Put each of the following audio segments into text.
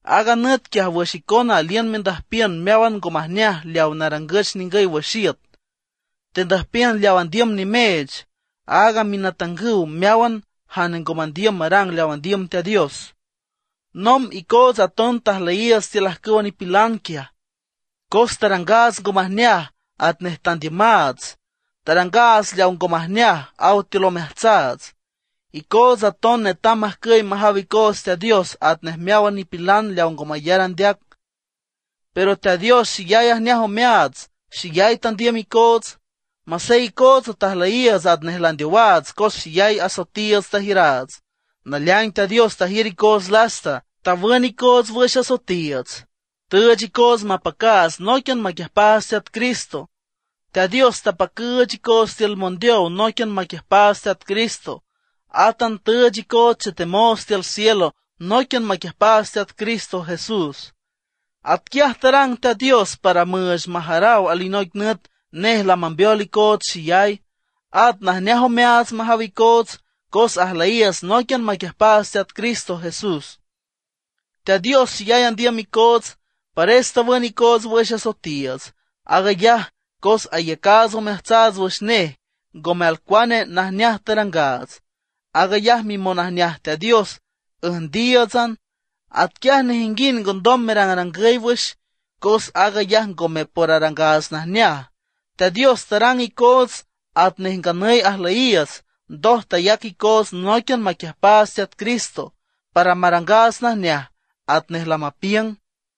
Aaga nüt quiaj wüx icona aliün mendüjpiün meáwan ngo majneaj leawa narangüch ningüy wüx iüt, tendüjpiün leaw andiüm nimeech, aaga minatangüw meáwan jane ngo mandiüm marang leaw andiüm Teat Dios. Nomb icootsa aton tajlüyiiüts tiül ajcüwa nipilan quiaj. Cos tarangaats ngo majneaj atnej tandiümaats; tarangaats leawa ngo majneaj aw tiül omeajtsaats. Icootsa aton netam majcüy majaw icoots Teat Dios atnej meáwan nipilan leaw ngo mayar andeac. Pero Teat Dios xeyay ajneaj omeaats, xeyay tandiüm icoots. Masey icootsa tajlüyiiüts atnej landeowaats cos xeyay asoetiiüts tajiüraats. Naleaing Teat Dios tajiür icoots lasta, tawün icoots wüx asoetiiüts, tüüch icoots mapacaats nóiquian maquiüjpaats Teat Cristo. Teat Dios tapacüüch icoots tiül mondeow nóiquian maquiüjpaats Teat Cristo, átan tüüch icoots chetemoots tiül cielo nóiquian maquiüjpaats Teat Cristo Jesús. Atquiaj tarang Teat Dios para müüch majaraw alinoic nüt nej lamambeol icoots xeyay, at najneaj omeaats majaw icoots cos ajlüyiiüts nóiquian maquiüjpaats Teat Cristo Jesús. Teat Dios xeyay andiüm icoots, pares tawün icoots wüx asoetiiüts, aag ayaj cos ayacaats omeajtsaats wüx nej, ngome alcuane najneaj tarangaats. Aag ayaj mimonajneaj Teat Dios üjndíiütsan. Atquiaj nejinguind ngondom merangrangüy wüx, cos aag ayaj ngome por arangaats najneaj. Teat Dios tarang icoots atnej nganüy ajlüyiiüts, ndoj tayac icoots nóiquian maquiüjpaats Teat Cristo para marangaats najneaj atnej lamapiüng.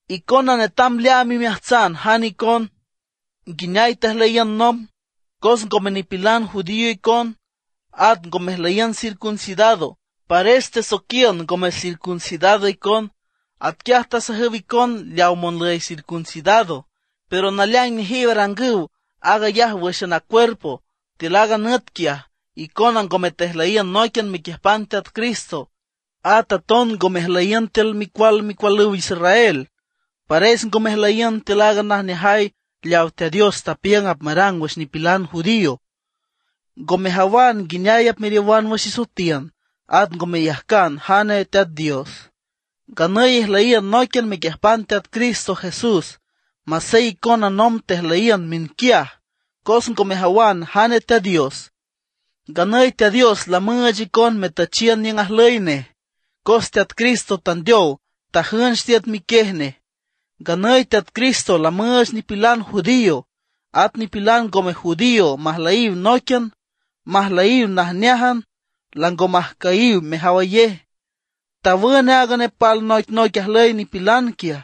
Icona netam leaam imeajtsan jane icon, nguineay tejlüyiün nomb. Cos ngome nipilan judío icon, at ngo mejlüyiün circuncidado; pares tesoiquiün ngome circuncidado icon. Atquiaj tasajüw icon leaw monlüy circuncidado, pero naleaing nejiw arangüw aag ayaj wǘxan a cuerpo. Tiül aaga nüt quiaj, icona ngome tejlüyiün nóiquian mequiüjpan Teat Cristo, at aton ngo mejlüyiün tiül micual micualüw Israel. Pares ngo mejlüyiün tiül aaga najneajay leawa Teat Dios tapiüng apmarang wüx nipilan judío. Ngo mejawan nguineay apmeriowan wüx isoetiün, at ngo meyajcan jane Teat Dios. Nganüy ijlüyiün nóiquian mequiüjpan Teat Cristo Jesús, masey icona nomb tejlüyiün miünquiaj, cos ngo mejawan jane Teat Dios. Nganüy Teat Dios lamüüch icon metüchiün niüng ajlüy nej, cos Teat Cristo tandeow tajünch tiüt miquiej nej. Nganüy Teat Cristo lamüüch nipilan judío at nipilan ngome judío majlüyiw nóiquian, majlüyiw najneájan, lango majcüyiw mejawayej. Tawün aaga nepal noicnoic ajlüy nipilan quiaj.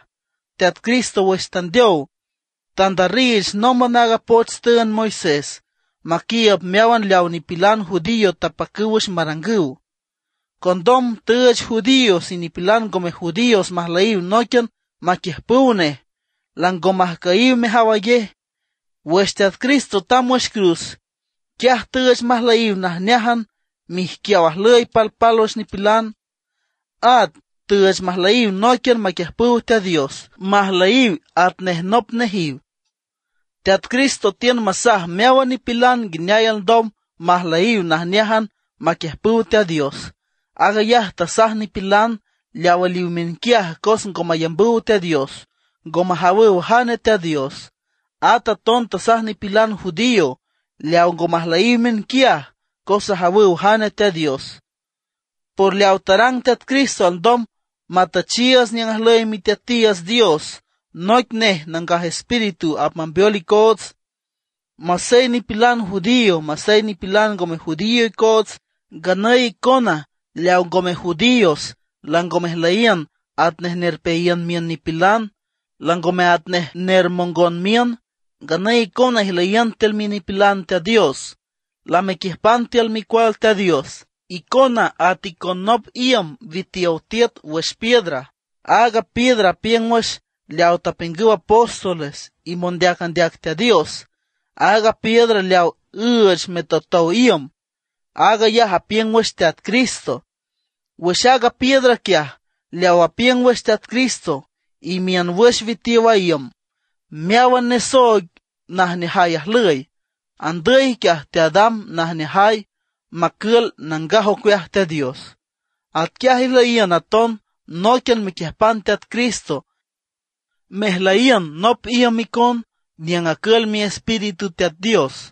Teat Cristo wüx tandeow, tandarriich nómban aaga poch tüünd Moisés, maquiiüb meáwan leaw nipilan judío tapacüw wüx marangüw. Condom tüüch judíos y nipilan ngome judíos majlüyiw nóiquian maquiüjpüw nej, lango majcüyiw mejawayej. Wüx Teat Cristo tamb wüx cruz, quiaj tüüch majlüyiw najneájan miijquiaw ajlüy palpálwüx nipilan. At tüüch majlüyiw nóiquian maquiüjpüw Teat Dios, majlüyiw atnej nop nejiw. Teat Cristo tiün masaj meáwan nipilan nguineay alndom majlüyiw najneájan maquiüjpüw Teat Dios. Aag ayaj tasaj nipilan leaw aliw miünquiaj cos ngo mayambüw Teat Dios, ngo majawüw jane Teat Dios. At aton tasaj nipilan judío leawa ngo majlüyiw miünquiaj, cos ajawüw jane Teat Dios. Por leaw tarang Teat Cristo alndom matüchiiüts niüng ajlüy Miteatiiüts Dios, noic nej Nangaj Espíritu apmambeol icoots, masey nipilan judío masey nipilan ngome judío icoots. Nganüy icona leaw ngome judíos lango mejlüyiün atnej nerpeayiün miün nipilan, langome atnej nermongon miün; nganüy icona ijlüyiün tiül minipilan Teat Dios, lamequiüjpan tiül micual Teat Dios. Icona at icon nop iüm witiow tiüt wüx piedra. Aaga piedra apiüng wüx leaw tapiüngüw apóstoles y mondeac andeac Teat Dios. Aaga piedra leaw üüch metotow iüm, aag ayaj apiüng wüx Teat Cristo. Wüx aaga piedra quiaj, leaw apiüng wüx Teat Cristo, imiün wüx witiow a iüm, meáwan nesooig najneajay ajlüy, andüy quiaj teadam najneajay, macül nangaj ocueaj Teat Dios. Atquiaj ijlüyiün aton nóiquian mequiüjpan Teat Cristo mejlüyiün nop iüm icon niüng acül Miespíritu Teat Dios.